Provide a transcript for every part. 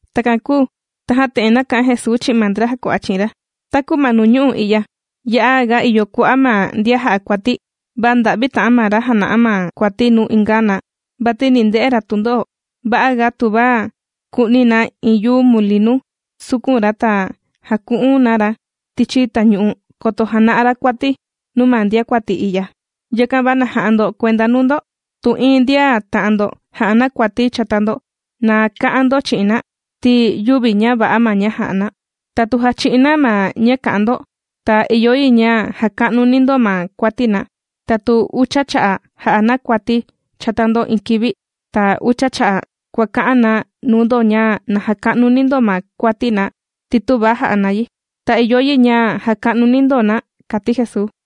Takan kūu tajan te'en nāka'an Jesuu chi'in ma ndra jàkua'a chi'in ra: ―Taku ma nuu ñu'u' i'ya ya'a ga ìyo kua'a' ma ndian jà'a kuati, va nda'vi ta'an ma ra jàna'a ma kuati nuu inga na vati ni nde'e ra tundo'o. Va'a ga tuva ku'ni na iin yuu mulinu sukun ra ta jaku'un na ra tichi tañu'u, koto jana'a ra kuati nuu ma ndiakuati i'ya. Yakan va na ja'a ndo kuenda nuu ndo. Tu iin ndian ta'an ndo ja'a na kuati chata ndo, na ka'an ndo chi'in na ti yüvi ña va'a ma ña jà'a na. Ta tu jachi'in na ma ña kà'an ndo, ta ìyo yi ña jaka'nuni ndo ma kuati na. Ta tu ucha cha'a' jà'a na kuati chata ndo iin kivi ta ucha cha'a' kuàka'an na nuu ndo ña na jaka'nuni ndo ma kuati na ti tüva ja'a na yi, ta ìyo yi ña jaka'nuni ndo na ―kàti Jesuu.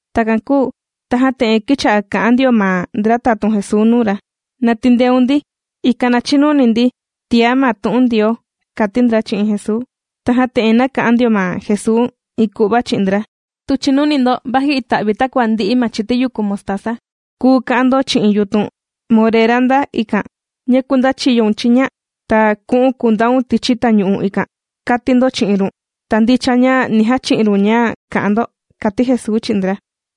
Takan kūu tajan te'en kīcha'a kà'an ndio ma ndra tatun Jesuu nuu ra: ―Na tindeun ndi, ikan na chinuni ndi tiá ma tu'un Ndioo ―kàti ndra chi'in Jesuu. Tajan te'en nāka'an ndio ma Jesuu iin ku'va chi'in ndra: ―Tu chìnuni ndo vaji ita'vi takua ndi'i ma chiti yuku mostaza, kuu ka'an ndo chi'in yutun morera nda ikan: “Ña kundachiyoun chiña ta ku'u̱n kundaun tichi tañu'u ikan”, kàti ndo chi'in run. Ta ndicha ña ni jachi'in run ña kà'an ndo ―kàti Jesuu chi'in ndra.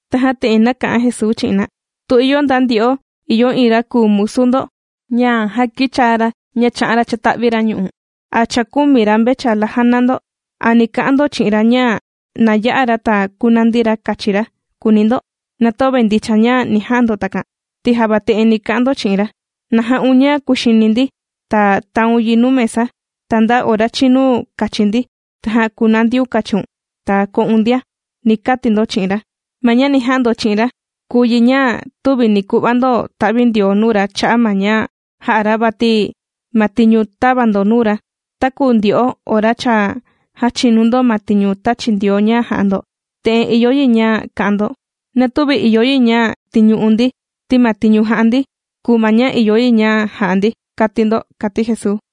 Tajan te'en nāka'an Jesuu chi'in na: ―Tu ìyo nda ndyo'o ìyo iin ra kùu musu ndo ña já kīchaa ra ña chā'an ra chāta'vi ra ñu'u' a chākumi ra mvechala jàna ndo, ¿a ni ka'an ndo chi'in ra ña na ya'a ra ta kunandi ra kachi ra?, kùuni ndo. Na töve ndicha ña ni ja'a ndo takan ti java te'en ni ka'an ndo chi'in ra: “Na ja'un ña kuxini ndi ta taun yi nuu mesa, ta nda ora chinu kachi ndi tajan kunandiun kachiun ta ko'un ndia”, ni kati ndo chi'in ra. Ma ña ni ja'a ndo chi'in ra kùu yi ña tüvi ni ku'va ndo ta'vindioo nuu ra cha'a' ma ña jā'a ra, vati ma tiñu tāva ndo nuu ra. Taku ndyo'o ora cha jàchinu ndo ma tiñu tāchi Ndioo ña jà'a ndo, te'en ìyo yi ña ka'an ndo: “Na tüvi ìyo yi ña tiñu'u̱n ndi, ti ma tiñu jā'a ndi kùu ma ña ìyo yi ña ja'a ndi”, kàti ndo ―kàti Jesuu.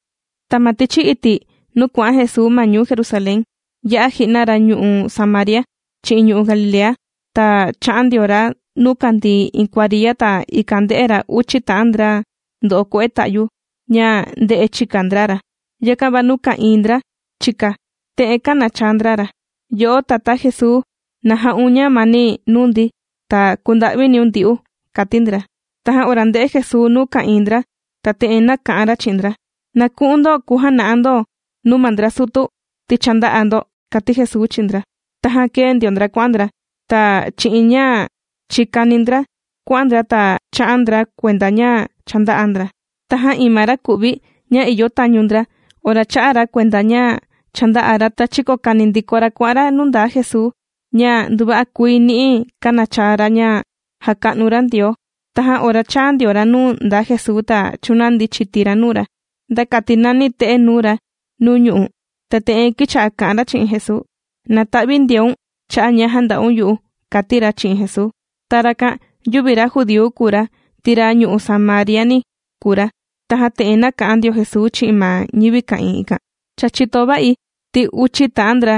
Ta ma tichi iti' nuu kuà'an Jesuu ma ñuu Jerusalén, yā'a ji'na ra ñu'u' Samaria chi'in ñu'u' Galilea. Ta chā'an ndio ra nuu kàndii iin kuariya ta ikan ndē'e ra uchi ta'an ndra ndo'o kue'e ta'yu ña ndē'e chika ndra ra. Yakan va nuu ka'ìin ndra chika, te'en kānachaa ndra ra: ―Yo'o Tatá Jesuu, na ja'un ñamani nuu ndi ta kunda'viniun ndyu'u ―kàti ndra. Tajan ora ndē'e Jesuu nuu ka'ìin ndra ta te'en nāka'an ra chi'in ndra: ―Na ku'un ndo kujana'a ndo ndo nuu ma ndra sutu ti cha ndā'a ndo ―kàti Jesuu chi'in ndra. Tajan kēe ndio ndra kuà'an ndra ta chi'in ña chìkani ndra kuà'an ndra ta chā'a ndra kuenda ña cha ndā'a ndra. Tajan iin ma raku'vi ña ìyo tañu ndra ora chā'a ra kuenda ña cha ndā'a ra, ta chīkokani ndiko ra kuà'an ra nuu ndaa Jesuu, ña nduva'a kuii ni'i kānachaa ra ña jàka'nu ra Ndioo. Tajan ora chāa ndio ra nuu ndaa Jesuu ta chūnandi chiti ra nuu ra nda kati nani te'e nuu ra nuu ñu'u'. Ta te'en kīcha'a kà'an ra chi'in Jesuu: ―Na ta'vindioun cha'a' ña jānda'un yu'u ―kàti ra chi'in Jesuu. Ta rakan yüvi ra judíu kùu ra ti ra ñu'u' Samariani kùu ra. Tajan te'en nāka'an ndio Jesuu chi'in ma ñivi ka'ìin ikan: ―Cha chìto va'i ti uchi ta'an ndra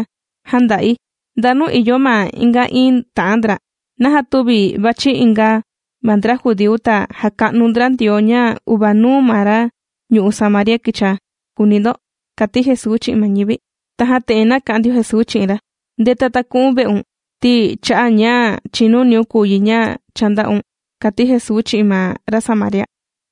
jānda'i. ¿Ndanu ìyo ma inga iín ta'an ndra? ¿Naja tüvi vàchi inga ma ndra judíu ta jaka'nu ndra Ndioo ña uvanuu ma ra ñu'u' Samaria kīchaa?, kùuni ndo ―kàti Jesuu chi'in ma ñivi. Tajan te'en nāka'an ndio Jesuu chi'in ra: ―Ndeta ta ku'un ve'un, ti cha'a' ña chìnuniun kùu yi ña cha ndā'un ―kàti Jesuu chi'in ma ra Samaria.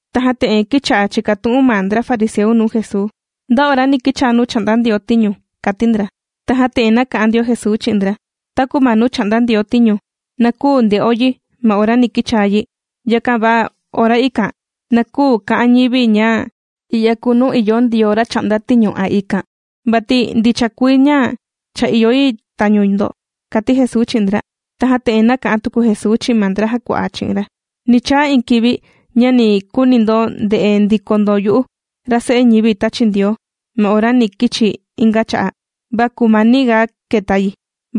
Tajan te'en kīcha'a chìkatu'un ma ndra fariseu nuu Jesuu: ―¿Nda ora ni kichaa nuu chà'nda Ndioo tiñu? ―kàti ndra. Ta te'en nāka'an ndio Jesuu chi'in ndra: ―Taku ma nuu chà'nda Ndioo tiñu na küu nde'o yi ma ora ni kichaa yi. Yakan va ma ora ikan na küu ka'an ñivi ña i'ya kùu nuu ìyo Ndioo ra chà'nda tiñu a ikan, vati ndicha kuii ña cha ìyo yi tañu ndo ―kàti Jesuu chi'in ndra. Tajan te'en nāka'an tuku Jesuu chi'in ma ndra jàkua'a chi'in ra: ―Ni chaa iin kivi ña ni kuuni ndo nde'e ndiko ndo yu'u ra Se'e ñivi tāchi Ndioo ma ora ni kichi̱ inga cha'a'. Va kumaniga kèta yi.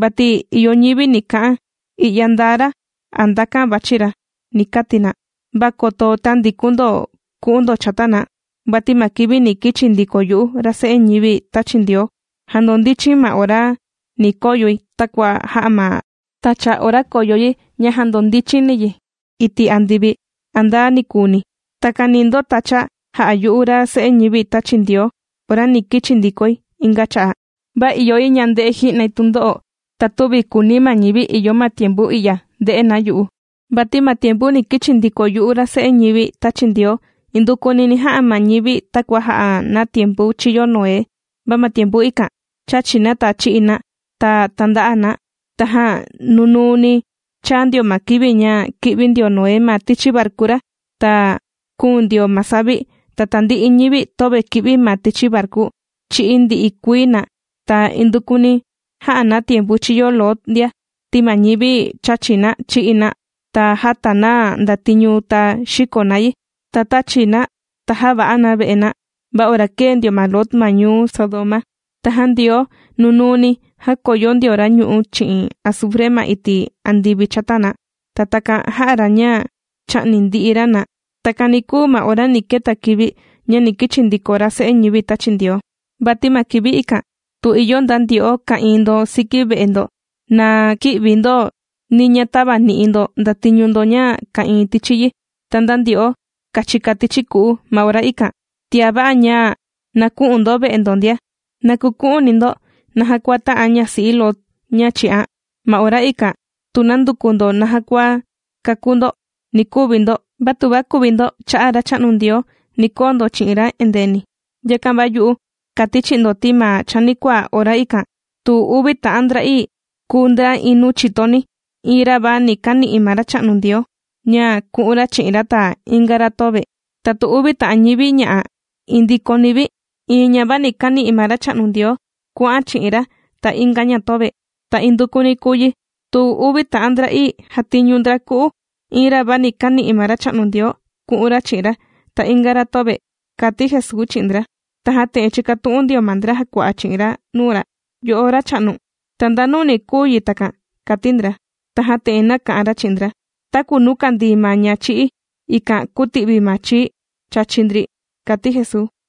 Vati ìyo ñivi ni ka'an: “I'ya ndaa ra”, a “Ndakan vàchi ra”, ni kati na. Va koto tändikun ndo ku'un ndo chata na. Vati ma kivi ni kichi ndiko yu'u, ra Se'e ñivi tāchi Ndioo jandondichi̱n ma ora ni koyoi takua jà'a ma tacha ora kòyo yi ña jandondichini yi iti' andivi a nda nikuuni. Takan ni ndotacha jà'a yu'u, ra Se'e ñivi tāchi Ndioo ora ni kichi ndikoi inga cha'a'. Va ìyo yi ña nde'e ji'nai tundo'o, ta tüvi kùuni ma ñivi ìyo ma tiempu i'ya nde'e na yu'u. Vati ma tiempu ni kichi ndiko yu'u ra Se'e ñivi tāchi Ndioo, indukuni ni ja'a ma ñivi takua jā'a na tiempu chīyo Noé. Va ma tiempu ikan, chàchi na ta chì'i na ta tànda'a na. Tajan nunuu ni chāa ndio ma kivi ña kī'vi ndio Noé ma tichi varku ra ta kūun ndio ma savi ta tandi'i ñivi töve kī'vi ma tichi varku chī'í ndi'i kuii na. Ta indukuni jā'a na tiempu chīyo Lot ndia, ti ma ñivi chàchi na, chì'i na, ta jàta na ndatiñu ta xìko na yi, ta tàchi na ta jàva'a na ve'e na, va ora kēe ndio ma Lot ma ñuu Sodoma, tajan Ndioo nunuu ni jākoyo ndio ra ñu'ú chi'in azufre ma iti' andivi chata na, ta takan jā'a ra ña chā'ni ndi'i ra na. Takan ni kuu ma ora ni keta kivi ña ni kichi ndiko ra Se'e ñivi tāchi Ndioo. ’Vati ma kivi ikan tu ìyo nda ndyo'o ka'ìin ndo siki ve'e ndo, na kï'vi ndo ni ña tävani'i ndo ndatiñu ndo ña ka'ìin tichi yi. Ta nda ndyo'o kàchika tichi ku'u ma ora ikan, tiá va'a ña na kü'un ndo ve'e ndo ndia. Na kuku'uni ndo naja kua tā'an ñasi'i Lot ña chī'an. Ma ora ikan tu nanduku ndo naja kua kakú ndo, ni kuvi ndo, va tuva kuvi ndo cha'a' ma Racha'nu Ndioo, ni koo ndo chi'in ra endeeni. ’Yakan va yu'u kàti chi'in ndo ti ma chanikuaa ora ikan tu uvi ta'an ndra kàndoyo ndra kìxi ndra tichi iin ve'eni, iin ra va ni kani'i ma Racha'nu Ndioo ña ku'un ra chi'in ra, ta inga ra töve. Ta tu uvi ta'an ñivi ña'a iin ndikoni vi, iin ña va ni kàni'i ma Racha'nu Ndioo kuà'an ña chi'in ra, ta inga ña töve. Ta indukuni kùu yi tu uvi ta'an ndra'ii jàtiñu ndra ku'u, iin ra va ni kàni'i ma Racha'nu Ndioo ku'un ra chi'in ra, ta inga ra töve ―kàti Jesuu chi'in ndra. Tajan te'en chīkatu'un ndio ma ndra jàkua'a chi'in ra nuu ra: ―Yo'o Racha'nu, ¿ta ndanu ni kuu yi takan? ―kàti ndra. Tajan te'en nāka'an ra chi'in ndra: ―Taku nuu kàndii ma ña chì'í, ikan kuti'vi ma chii chàchi ndri ―kàti Jesuu.